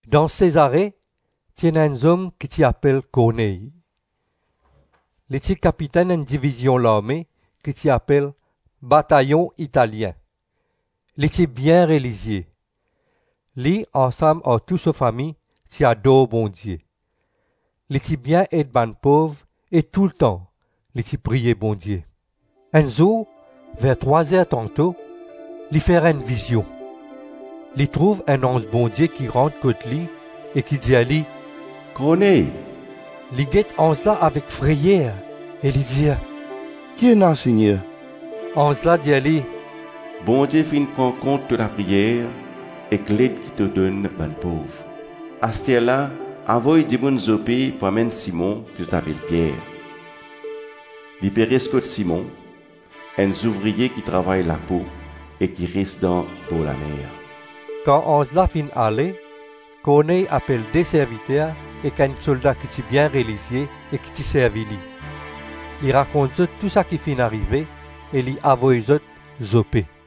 Dan Sezare ti ena enn zom ki ti apel Korney. Li ti kapitenn enn divizion larme ki ti apel ‘Batayon Italien.’ Li ti bien relizie; li ansam ar tou so fami ti ador Bondie. Li ti bien ed bann pov e toultan li ti priye Bondie. Enn zour ver trwa-zer tanto, li fer enn vizion. Li trouv enn anz Bondie ki rant kot li e ki dir li, “Korney!” Li get anz la avek freyer e li dir, “Ki ena, Segner?” Anz la dir li, “Bondie finn pran kont to lapriyer ek led ki to donn bann pov. Asterla, avoy dimoun Zope pou amenn Simon, ki zot apel Pier. Li pe res kot Simon, enn zouvrie ki travay lapo e ki res dan borlamer.” Kan anz la finn ale, Korney apel de serviter ek enn solda ki ti bien relizie e ki ti servi li. Li rakont zot tou saki finn arive, e li avoy zot Zope.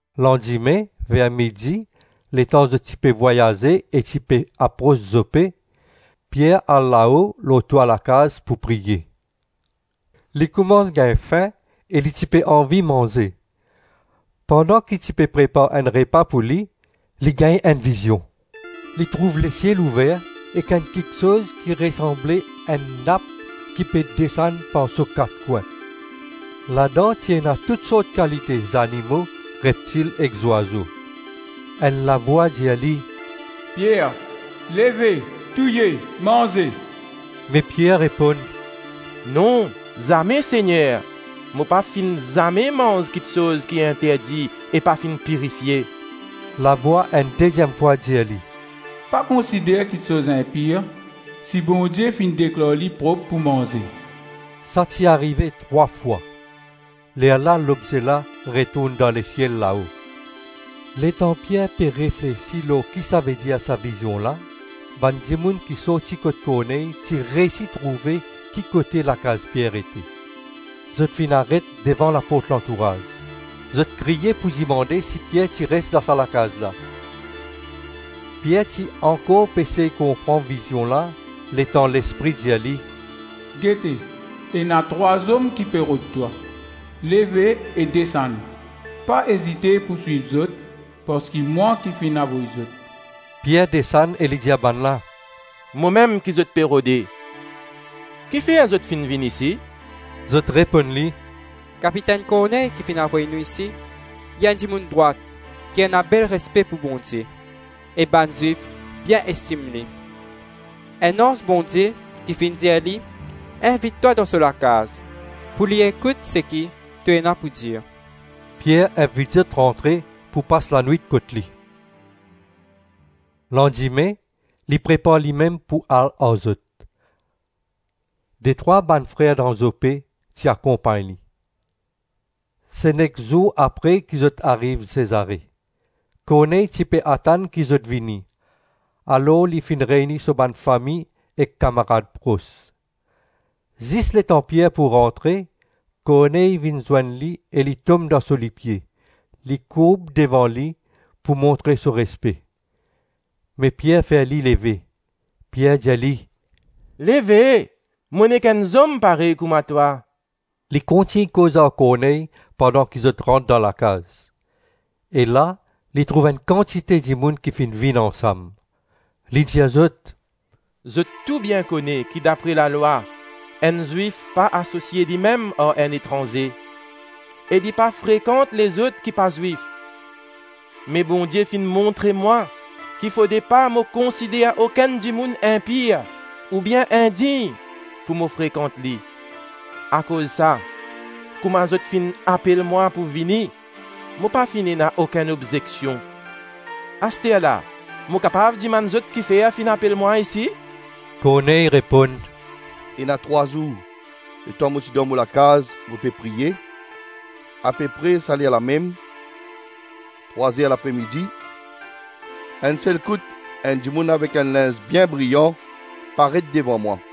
Landime ver midi letan zot ti pe vwayaze e ti pe apros Zope, Pier al lao lor twa lakaz pou priye. Li koumans gagn fin e li ti pe anvi manze. Pandan ki ti pe prepar enn repa pou li, li gagn enn vizion. Li trouv lesiel ouver ek enn kiksoz ki resanble enn nap ki pe desann par so kat kwin. Ladan ti ena tousort kalite zanimo, reptil ek zwazo. Enn lavwa dir li, “Pier, leve; touye, manze.” Me Pier reponn, “Non, zame, Segner. Mo pa finn zame manz kiksoz ki interdi e pa finn pirifie.” Lavwa enn deziem fwa dir li, “Pa konsider kiksoz inpir si Bondie finn deklar li prop pou manze.” Sa ti arive trwa fwa, lerla lobze la retourn dan lesiel lao. Letan Pier pe reflesi lor kisavedir sa vizion la, bann dimoun ki sorti kot Korney ti reysi trouve kikote lakaz Pier ete. Zot finn aret devan laport lantouraz. Zot kriye pou dimande si Pier ti res dan sa lakaz la. Pier ti ankor pe sey konpran vizion la letan Lespri dir li, “Gete, ena trwa zom ki pe rod twa. Leve e desann. Pa ezite pou swiv zot parski mwa ki finn avoy zot.” Pier desann e li dir bannla, “Momem ki zot pe rode. Kifer zot finn vinn isi?” Zot reponn li, “Kapitenn Korney ki finn avoy nou isi. Li enn dimoun drwat ki ena bel respe pou Bondie, e bann Zwif bien estim li. Enn anz Bondie ki finn dir li invit twa dan so lakaz pou li ekout seki to ena pou dir.” Pier invit zot rantre pou pas lanwit kot li. Landime li prepar limem pou al ar zot. Detrwa bann frer dan Zope ti akonpagn li. Se nek zour apre ki zot ariv Sezare. Korney ti pe atann ki zot vini, alor li finn reyni so bann fami e kamarad pros. Zis letan Pier pou rantre, Korney vinn zwenn li e li tom dan so lipie, li kourb devan li pou montre so respe. Me Pier fer li leve. Pier dir li, “Leve. Mo nek enn zom parey kouma twa.” Li kontign koz ar Korney pandan ki zot rant dan lakaz, e la li trouv enn kantite dimoun ki finn vinn ansam. Li dir zot, “Zot tou bien kone ki dapre lalwa, enn Zwif pa asosie limem ar enn etranze, e li pa frekant lezot ki pa Zwif. Me Bondie finn montre mwa ki fode pa mo konsider okenn dimoun inpir oubien indign pou mo frekant li. Akoz sa, kouma zot finn apel mwa pou vini, mo pa finn ena okenn obzeksion. Asterla, mo kapav dimann zot kifer finn apel mwa isi?” Korney reponn, “Ena trwa zour letan mo ti dan mo lakaz mo pe priye, apepre sa lerlamem, trwa-zer lapre-midi, enn sel kout enn dimoun avek enn linz bien briyan, paret devan mwa.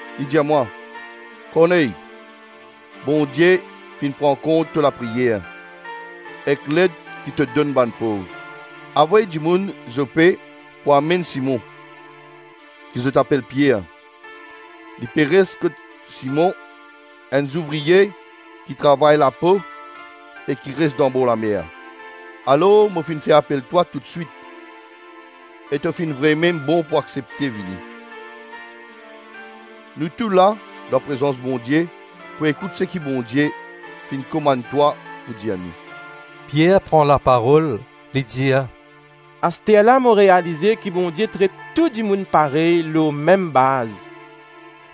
Li dir mwa, ‘Korney, Bondie finn pran kont to lapriyer ek led ki to donn bann pov. Avoy dimoun Zope pou amenn Simon, ki zot apel Pier. Li pe res kot Simon, enn zouvrie ki travay lapo e ki res danbor lamer.’ Alor mo finn fer apel twa toutswit, e to finn vremem bon pou aksepte vini. Nou tou la, dan prezans Bondie pou ekout seki Bondie finn komann twa pou dir nou.” Pier pran laparol, li dir, “Asterla mo realize ki Bondie tret tou dimoun parey lor mem baz.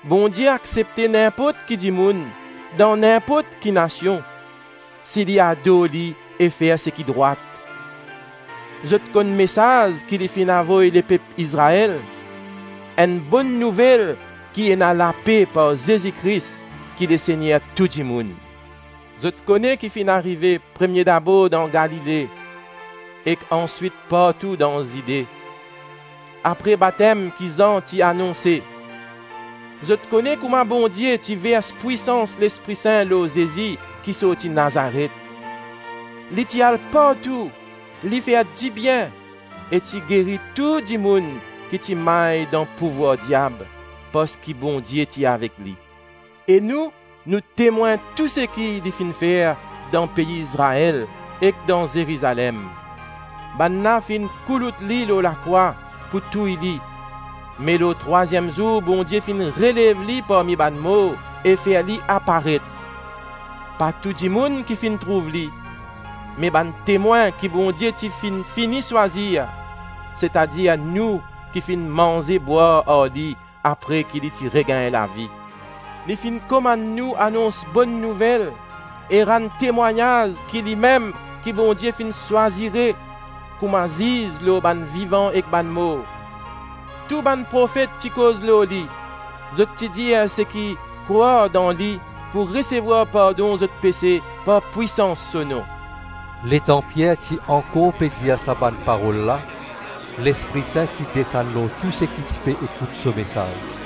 Bondie aksepte ninport ki dimoun dan ninport ki nasion si li ador li e fer seki drwat. Zot konn mesaz ki li finn avoy lepep Izrael, enn Bonn Nouvel ki ena lape par Zezi Kris ki Lesegner tou dimoun. Zot kone ki finn arive premie dabor dan Galile, ek answit partou dan Zide, apre batem ki Zan ti anonse. Zot kone kouma Bondie ti vers pwisans Lespri Sin lor Zezi ki sorti Nazaret. Li ti al partou, li fer dibien e ti geri tou dimoun ki ti may dan pouvwar diab, parski Bondie ti avek li. E nou, nou temwin tou seki li finn fer dan pei Izrael ek dan Zerizalem. Bannla finn koulout li lor lakrwa pou touy li. Me lor trwaziem zour Bondie finn relev li parmi bann mor, e fer li aparet. Pa tou dimoun ki finn trouv li, me bann temwin ki Bondie ti finn fini swazir, setadir nou ki finn manze-bwar ar li apre ki li ti regagn lavi. Li finn komann nou anons Bonn Nouvel e rann temwagnaz ki limem ki Bondie finn swazire kouma ziz lor bann vivan ek bann mor. Tou bann profet ti koz lor li. Zot ti dir seki krwar dan li pou resevwar pardon zot pese par pwisans so nom.” Letan Pier ti ankor pe dir sa bann parol la, Lespri Sin ti desann lor tou seki ti pe ekout so mesaz.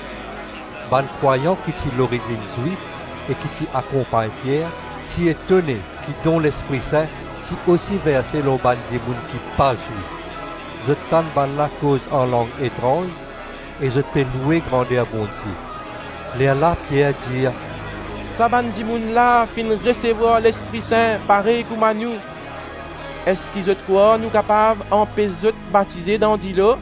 Bann krwayan ki lorizinn Zwif e ki ti akonpagn Pier, ti etone ki don Lespri Sin ti osi verse lor bann dimoun ki pa Zwif. Zot tann bannla koz anlang etranz e zot pe loue grander Bondie. Lerla Pier dir, “Sa bann dimoun la finn resevwar Lespri Sin parey kouma nou, eski zot krwar nou kapav anpes zot batize dan dilo?”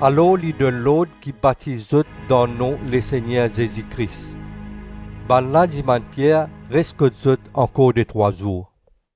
Alor li donn lord ki batiz zot dan nom Lesegner Zezi Kris. Bannla dimann Pier res kot zot ankor detrwa zour.